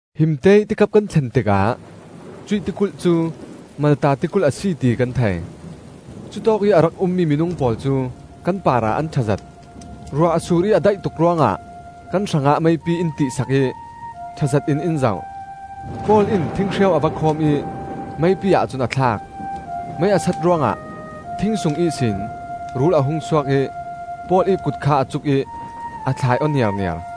Himteih tikap kan thlen tikah cuih tikulh cu Malta tikulh a si ti kan thei. Cutawkih a rak ummi minung pawl cu kan parah an ṭhazet. Ruah a sur ih a daih tuk ruangah kan hrangah meipi in tih sak ih ṭhazet in in zoh. Paul in thinghreu a va khawm ih meipi-ah cun a thlak. Mei a sat ruangah thing sung ihsin rul a hung suak ih Paul ih kut kha a cuk ih a thlai aw niarniar.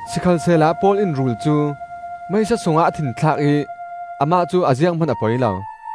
Sikhalsehla Paul in rul cu meisa sungah a thinthlak ih amah cu a zianghman a poi lo.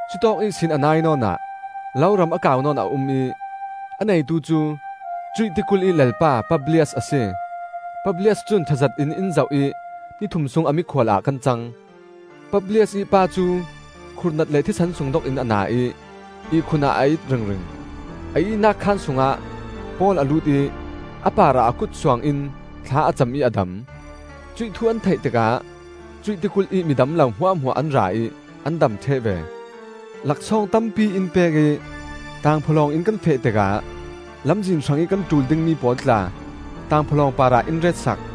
Cutawk ihsin a nai nawn ah loram a kau nawn a um ih a neitu cu cuih tikulh ih lalpa Publias a si. Publias cun ṭhazet in in zoh ih ni thum sung a mikhual ah kan cang. Publias ih pa cu khurhnat le thisen sungdok in a na ih ihkhun ah a it ringring. A ihnak khaan sungah Paul a lut ih a parah a kut suangin thla a cam ih a dam. Cuih thu an theih tikah cuih tikulh ih midam lo hmuahhmuah an ra ih an dam ṭheh ve. Laksawng tampi in pek ih tangphawlawng in kan feh tikah lamzin hrangih kan ṭul dingmi pawl tla tangphawlawng parah in ret sak.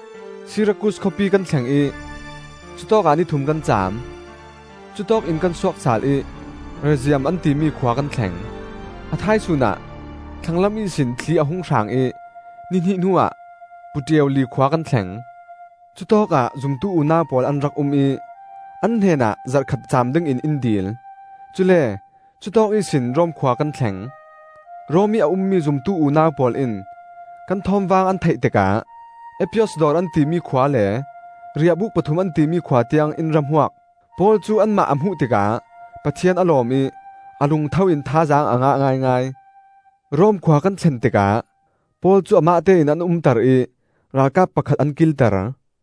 Sirakus khawpi kan thleng ih cutawkah ni thum kan caam. Cutawkin kan suak sal ih Rezium an timi khua kan thleng. A thaisun ah thlanglam ihsin thli a hung hrang ih ni hnih hnuah Puteoli khua kan thleng. Cutawkah zumtu unau pawl an rak um ih an hnenah zarh khat caam dingin in dil. Cule cutawk ihsin Rom khua kan thleng. Rom ih a ummi zumtu unau pawl in kan thawmvang an theih tikah Appius Dawr an timi khua le Riahbuk Pathum an timi khua tiang in ra hmuak. Paul cu anmah a hmuh tikah Pathian a lawm ih a lungtho in thazaang a ngah ngaingai. Rom khua kan thlen tikah Paul cu amahte in an umter ih ralkap pakhat an kilter.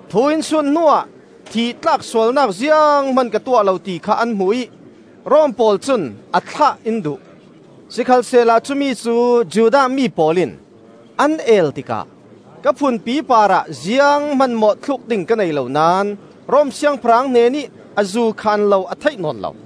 Thu in sut hnuah thih tlak sualnak zianghman ka tuah lo ti kha an hmu ih Rom pawl cun a thlah in duh. Sikhalsehla cumicu Judah mi pawl in an el tikah ka phunpi parah zianghman mawhthluk ding ka nei lo naón Rom siangpahrang hnenih azu khaan lo a theih nawn lo.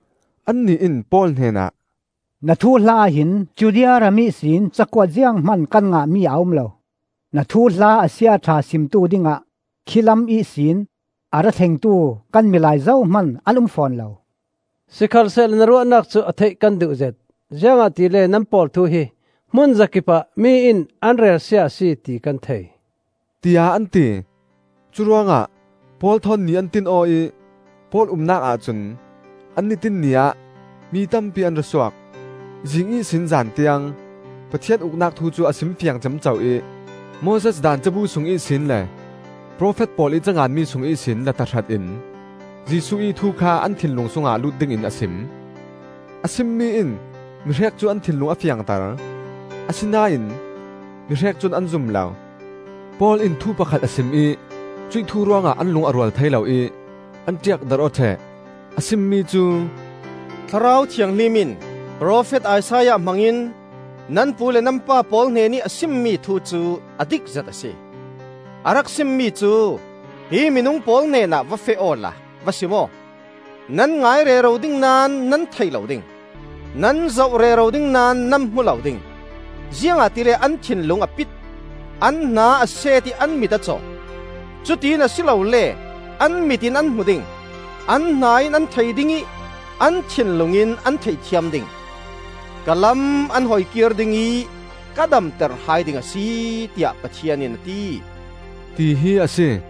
Annih in Paul hnenah, “Na thuhla ah hin Judea ram ihsin cakuat zianghman kan ngahmi a um lo. Na thuhla a sia a ṭha simtu dingah khilam ihsin a ra thlengtu kan milai zohman an um fawn lo. Sikhalsehla na ruahnak cu a theih kan duhzet, ziangahtile nan pawl thu hi hmunzakipah mi in an relsia a si ti kan thei,” tiah an ti. Curuangah Paul thawn ni an tin aw ih Paul umnak ahcun an ni tin ni ah mi tampi an ra suak. Zing ihsin zan tiang, Pathian Uknak thu cu a simfiang ciamco ih, Moses Daan cabu sung ihsin le profet pawl ih canganmi sung ihsin la tahratin Jesuh ih thu kha an thinlung sungah lut dingin a sim. A simmi in mihrek cu an thinlung a fiangter, asinain mihrek cun an zum lo. Paul in thu pakhat a sim ih cuih thu ruangah an lung a rual thei lo ih an ṭiakdarh aw ṭheh. A simmi cu, “Thlarau Thianghlim in, Profet Isaiah hmangin, nan pu le nan pa pawl hnenih a simmi thu cu a dikzet a si. A rak simmi cu: ‘Hi minung pawl hnenah va feh awla va sim aw; Nan ngai rero ding naón nan thei lo ding; Nan zoh rero ding naón nan hmu lo ding. Ziangahtile an thinlung a pit, an hna a set ih an mit a caw. Cutin a si lole an mit in an hmu ding; An hna in an thei ding ih, an thinlung in an theithiam ding. Ka lam an hoikir ding ih ka damter hai ding a si, tiah Pathian in a ti,’,” tihi a si.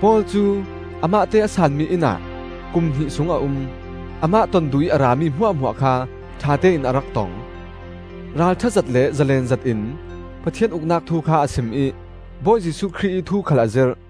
Paul cu amahte a saanmi innah kum hnih sung a um. Amah ton duhih a rami hmuahhmuah kha ṭhatein a rak tong. Ralṭhazet le zalen zetin Pathian Uknak thu kha a sim ih Bawi Jesuh Khrih ih thu khal a zirh.